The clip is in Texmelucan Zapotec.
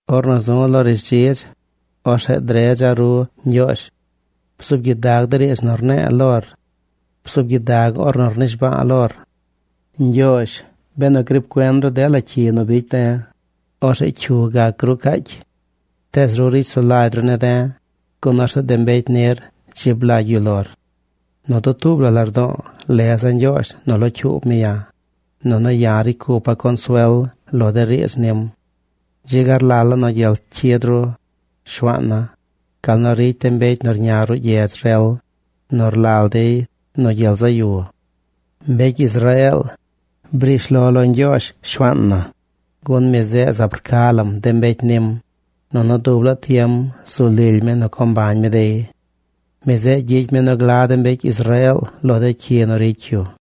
Ornu zu̱ lo rishdzidz, orzeꞌ dredza̱ ru, Ñgyoozh. Bzuub gyidag de riidz nu rne̱e̱ lor. Bzuub gyidag ornu rnishba̱a̱ lor. Ñgyoozh, benu griib cuen ru dela cyi nu bicy de̱, orzeꞌ ¿cyu gac gruu caacy? Tees ru ricy sulagy ru ne̱ de̱, gun orzeꞌ de mbecy nir dzib lagy yu lor. Nu dutuub la lardo̱o̱ leza̱ Ñgyoozh nu locyuub mi ya̱, nunu ya̱ ricy cupa̱ consuel lo de riidz nim. Dzi ga rlala̱ nu gyel cyid ru, Shuaan na, gal nu ricy de mbecy nu rña ruꞌ gyedz rel, nu rlal dey nu gyel zaꞌ yu. Mbecy Israeel, briish lo lo Ñgyoozh, Shuaan na, gun mi zeꞌ zaab rca lam de mbecy nim, nunu dub laa tiem zu lily mi nu co mbañ mi dey. Mi zeꞌ gyicy mi nu gla de mbecy Israeel lo dela cyi nu ricy yu.